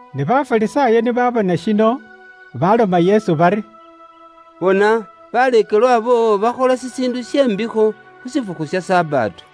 Ne Bafarisaayo ni baabona shino, baloma Yesu bari, “Bona, baleekelwa boowo bakhola shishiindu she mbikho khu shifukhu sha Sabato.”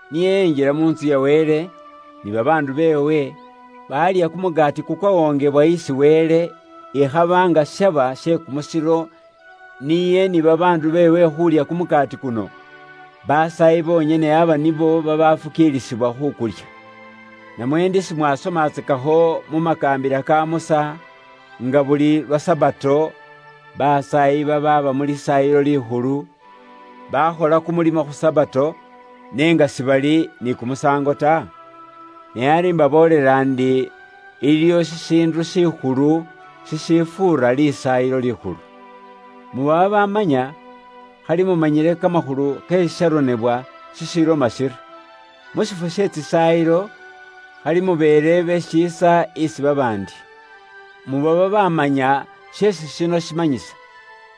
Niye enjila mu ntsu ya Wele, ni babaandu beewe, baalya kumukaati kukwawongewa isi Wele, ikhaba nga shaba she kumusilo niye ni babaandu beewe khuulya kumukaati kuno. Basaayi bonyene aba nibo babafukiilisibwa khukulya. Namwe inywe si mwasomakho mu makaambila ka Musa, nga buli lwa Sabato, basaayi babaaba mu Lisaayilo Likhulu, bafuniaaka likaambila lye khu Sabato, ne nga sibali ni kumusaango ta? Ne ari imbaboolela ndi, iliyo shishiindu shikhulu shishifuura Lisaayilo Likhulu. Muba babamanya, khali mumanyile kamakhulu ke shisharonebwa shishiloma shiri, ‘Mu shiifwo she tsisaayilo, khali mubeele be shiisa isi babaandi.’ Muba babamanya sheesi shino shimanyisa,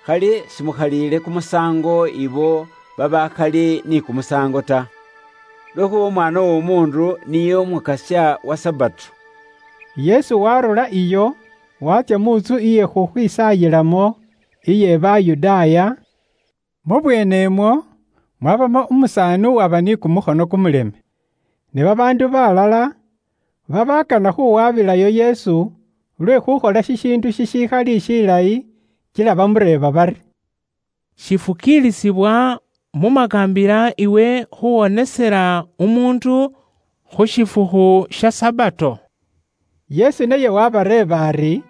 khali simukhaliile kumusaango ibo babaakhali ni kumusaango ta. Lwekhuuba Umwaana w'Omuundu niye Umukasya wa Sabato.” Yesu waarurayo iyo waatsya mu ntsu iye khukhwisaayilamo iye Bayudaaya, mu bweenemwo mwabamo umusaani uwaba ni kumukhono kumuleme. Ne babaandu balala babaakana khuwabilayo Yesu lwe khukhola shishiindu shishikhali shilayi, kila bamureeba bari, “Shifukilisibwa mu makaambila iwe khuwonesela umuundu khu shifukhu sha Sabato?” Yesu naye wabareeba ari,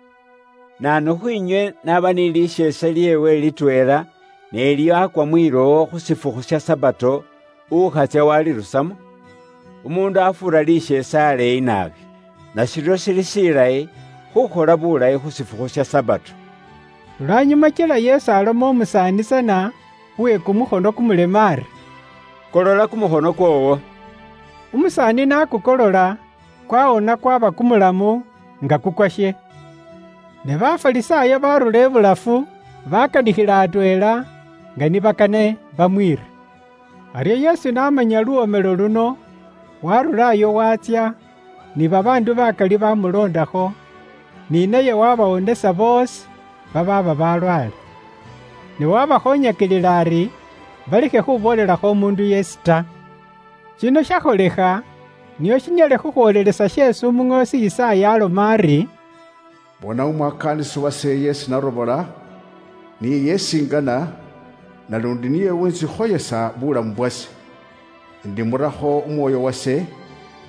“Naanu khwiinywe n'aba ni lisheese lyeewe litweela ne lyaakwa mwilowo khu shifukhu sha Sabato, ukhatsya walirusamo? Umuundu afuura lisheese aleeyi naabi! Nashiryo shili shilayi khukhola bulayi khu shifukhu sha Sabato.” Lwanyuma kila Yesu aloma umusaani tsana uwe kumukhono kumuleme ari, “Kolola kumukhono kwoowo.” Umusaani n'akukolola, kwaaba kwawonele, nga kuli nga kukwashe. Ne Bafarisaayo barura ibulafu, bakanikhila atweela, nga ni bakane bamwiire. Aryo Yesu n'amanya khu luwomelo luno, waarurayo waatsya, ni babaandu bakali bamuloondakho, ni naye wabawonesa boosi babaaba balwaale. Ne waabakhoonyakilila ari balekhe khuboolelakho umuundu yeesi ta. Shino shakholekha nio shinyale khukhwoolelesa sheesi umuŋoosi Yisaaya aloma ari, “Bona, umwakaanisi wase isi narobola, niye isi ingana, naluundi niye uwuntsikhoyesa buulamu bwase, indimurakho Umwoyo wase,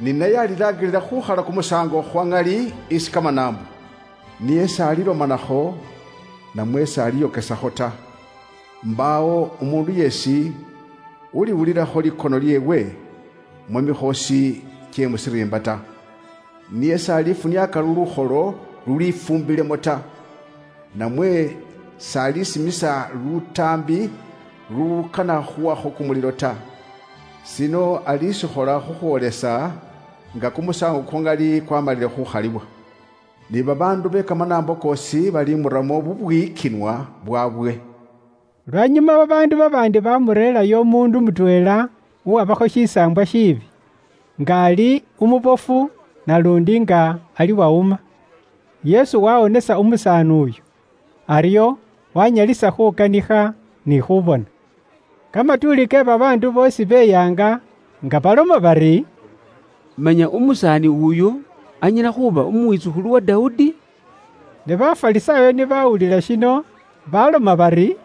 ni naye alilaangilila khuukhala kumusaango khwa ŋali isi kamanaambo, Niye s'alilomanakho, namwe s'aliyokesakho ta. Mbaawo umuundu yeesi uliwulilakho likono lyeewe mu mikhoosi kye mu shiriimba ta. Niye s'alifuniaaka lukholo lulwifuumbilemo ta, namwe s'alisimisa lutaambi lulukana khuwakho kumulilo ta. Shino alishikhola khukhwoolesa nga kumusaango kwa ŋali kwaamalile khuukhaliwa. Ni babaandu be kamanaambo koosi balimuramo bubwiyikinwa bwaabwe.” Lwanyuma babaandu babaandi baamureerayo umuundu mutweela uwaba ataambisibwa ni kimisaambwa, nga ali umubofu naluundi nga ali wawuma. Yesu waawonesa umusaani uyo, aryo waanyalisa khuukanikha ni khuubona. Kamatuuli ke babaandu boosi beyaanga, nga baloma bari, “Manya umusaani uyu anyala khuuba umwitsukhulu wa Dawudi?” Ne Bafarisaayo ni bawulila shino, baloma bari,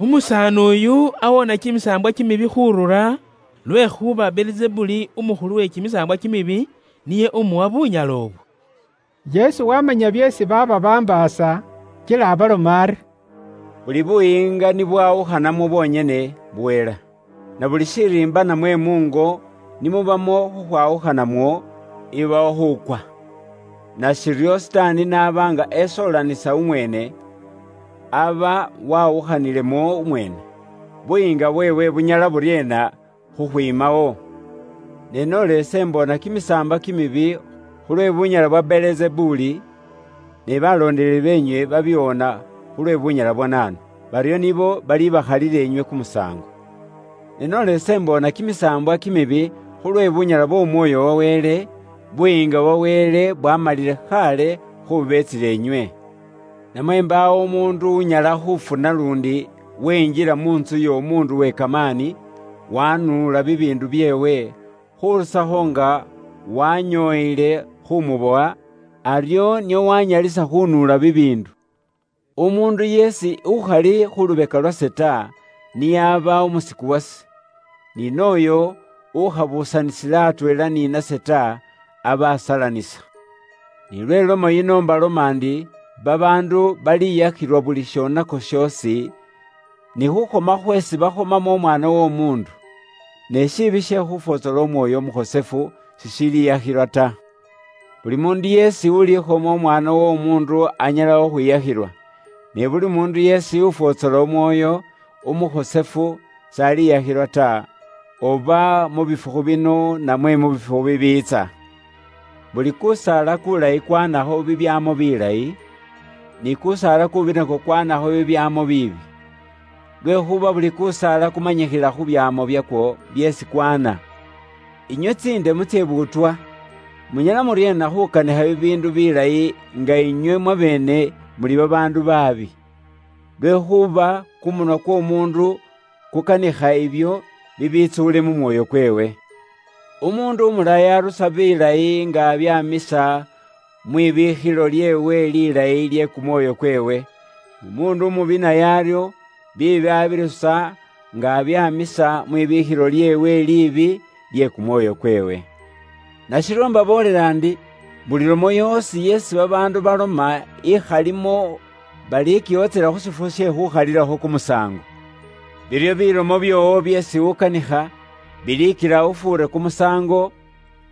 “Umusaani uyu awoona kimisaambwa kimibi khuurura, lwekhuuba Belizebuli umukhulu we kimisaambwa kimibi niye umuwa bunyala ibwo.” Yesu waamanya byeesi baaba bambaasa kila abaloma ari, “Buli buyiinga ni bwawukhanamwo bwonyene, buhela. Na buli shiriimba namwe muungo ni mubamo khukhwawukhanamwo, ibawo khuukwa. Nashiryo Sitaani n'aba nga esoolanisa umweene, aba wawukhanilemo umweene, buyiinga bweewe bunyala buryeena khukhwiimawo? Ne noola ise imboona kimisaambwa kimibi khulwe bunyala bwa Belizebuli, ne baloondeleli beenywe babiwoona khulwe bunyala bwa naanu? Baryo nibo balibakhalila inywe kumusaango. Ne noola ise imboona kimisaambwa kimibi khulwe bunyala bw'Omwoyo wa Wele, Buyiinga bwa Wele bwaamalile khaale khubeetsila inywe. “Namwe mbaawo umuundu unyala khuufuna luundi wenjila mu ntsu y'omuundu uwe kamaani, wanuula bibiindu byeewe, khurusakho nga wanyooyile khumubowa, aryo nio wanyalisa khunuula bibiindu. “Umuundu yeesi ukhali khu lubeka lwase ta niye aba umusiku wase. Ni nooyo ukhabuusanisila atweela ni nase ta, aba asalanisa. Ni lwe lomo yino mbaloma ndi, babaandu baliyakhilwa buli shonako shoosi, ni khukhoma khweesi bakhomamo Umwaana w'Omuundu. Ne shiibi she khufwotsola Umwoyo Umukhosefu, sishiliyakhilwa ta. Buli muundu yeesi ulikhoma Umwaana w'Omuundu anyala khukhwiyakhilwa, ne buli muundu yeesi ufwotsola Umwoyo Umukhosefu si bali mwiyakhila bibyoonako ta, oba mu muboolo kuno, namwe kukwiitsa muumoni. “Buli kusaala kuulayi kwaanakho bibyaamo bilayi, ni kuusaala kuubi nakwo kwaanakho bibyaamo biibi. Lwekhuuba buli kusaala kumanyikhila khu byaamo byakwo byeesi kwaana. Inywe tsindemu tse buutwa! Munyala muryeena khukanikha bibiindu bilayi nga inywe mwabeene muli babaandu baabi? Lwekhuuba kumunwa kw'omuundu kukanikha ibyo bibitsuule mu mwoyo kweewe. Umuundu umulayi arusa bilayi nga abyaamisa mwibiikhilo lyeewe lilayi lye kumwoyo kweewe, n'umuundu umubi naye aryo biibi abirusa nga abyaamisa mwibiikhilo lyeewe liibi lye kumwoyo kweewe. Nashiryo imbaboolela ndi, buli lomo yoosi yeesi babaandu baloma ikhalimo kumukaso ta, balikiwotsela khu shifukhu she khuukhalilakho kumusaango. Biryo bilomo byoowo byeesi ukanikha bilikila ufuure kumusaango,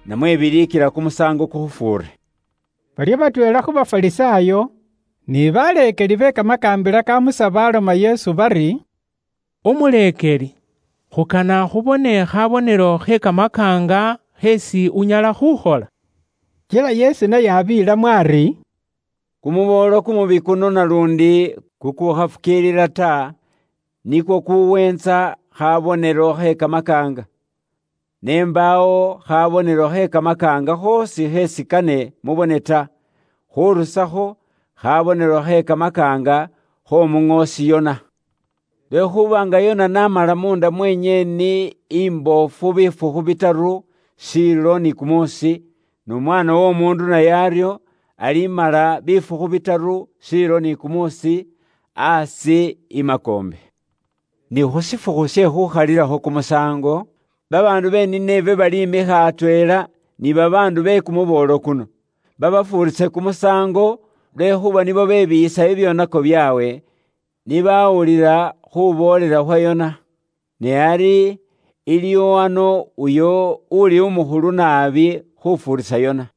namwe bilikila kumusaango kukhufuure.” Baryo batweela khu Bafarisaayo, ni baleekeli be kamakaambila ka Musa baloma Yesu bari, “Umuleekeli, khukana khubone khabonelo khe kamakaanga kheesi unyala khukhola.” Kila Yesu naye abeelamo ari, “Kumuboolo kumubi kuno naluundi kukukhafukiilila ta, nikwo kuweentsa khabonelo khe kamakaanga. Ne mbaawo khabonelo khe kamakaanga khoosi kheesi kane mubone ta, khurusakho khabonelo khe kamakaanga kh'omuŋoosi Yona. Lwekhuuba nga Yona n'amala munda mwe nyeeni imboofu bifukhu bitaru shiilo ni kumuusi, n'Umwaana w'Omuundu naye aryo alimala bifukhu bitaru shiilo ni kumuusi aasi i makoombe. Ne khu shifukhu she khuukhalilakho kumusaango, babaandu be Nineve balimikha atweela ni babaandu be kumuboolo kuno, babafuurise kumusaango, lwekhuuba nibo bebiiyisa bibyoonako byaabwe, ni bawulila khuboolela khwa Yona. Ne ari iliwo ano uyo uuli umukhulu naabi khufuurisa Yona.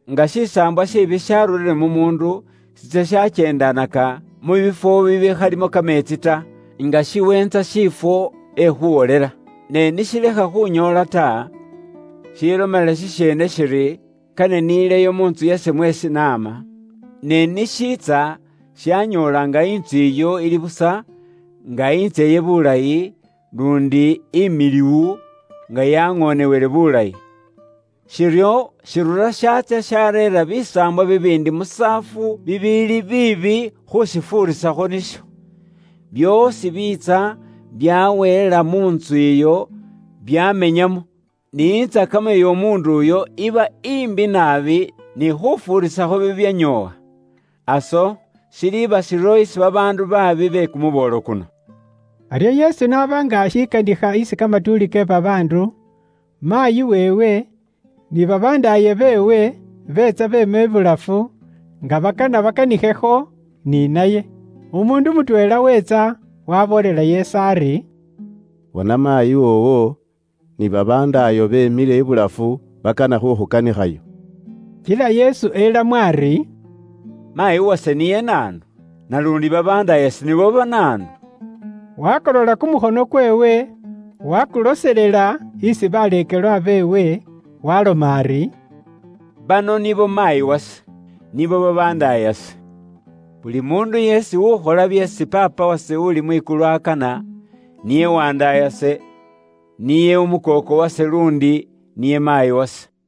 “Nga shisaambwa shiibi shaarurire mu muundu, shitsya shakyeendanaka mu biifwo bibikhalimo kameetsi ta, nga shiweentsa shiifwo ekhuwolela. Ne ni shilekha khunyoola ta, shiilomela shisheene shiri, ‘Kane nileyo mu ntsu yase mweesi naama.’ Ne ni shiitsa shanyoola nga intsu iyo ili busa, nga intseye bulayi, luundi imiliwu, nga yaŋoonewele bulayi. Shiryo, shirura shatsya shareera bisaambwa bibiindi musaafu bibiili biibi khushifuurisakho nisho. Byoosi biitsa byaweela mu ntsu iyo, byamenyamo. Ni intsakamo iy'omuundu uyo iba imbi naabi ni khufuurisa bibyanyoowa. Aso shiliiba shiryo isi babaandu baabi be kumuboolo kuno.” Aryo Yesu n'aba nga ashikanikha isi kamatuuli ke babaandu, maayi weewe, ni babandaaye beewe beetsa beema ibulafu, nga bakana bakanikhekho ni naye. Umuundu mutweela weetsa waboolela Yesu ari, “Bona maayi woowo ni babandaayo beemile ibulafu bakana khukhukanikhayo.” Kila Yesu elamo ari, “Maayi wase niye naanu? Naluundi babandaayase nibo banaanu?” Wakolola kumukhono kweewe wakuloselela isi baleekelwa beewe, waaloma ari, “Bano nibo maayi wase, nibo babandaayase. Buli muundu yeesi ukhola byeesi Paapa wase uli mwikulu akana, niye wandaayase, niye umukooko wase luundi niye maayi wase.”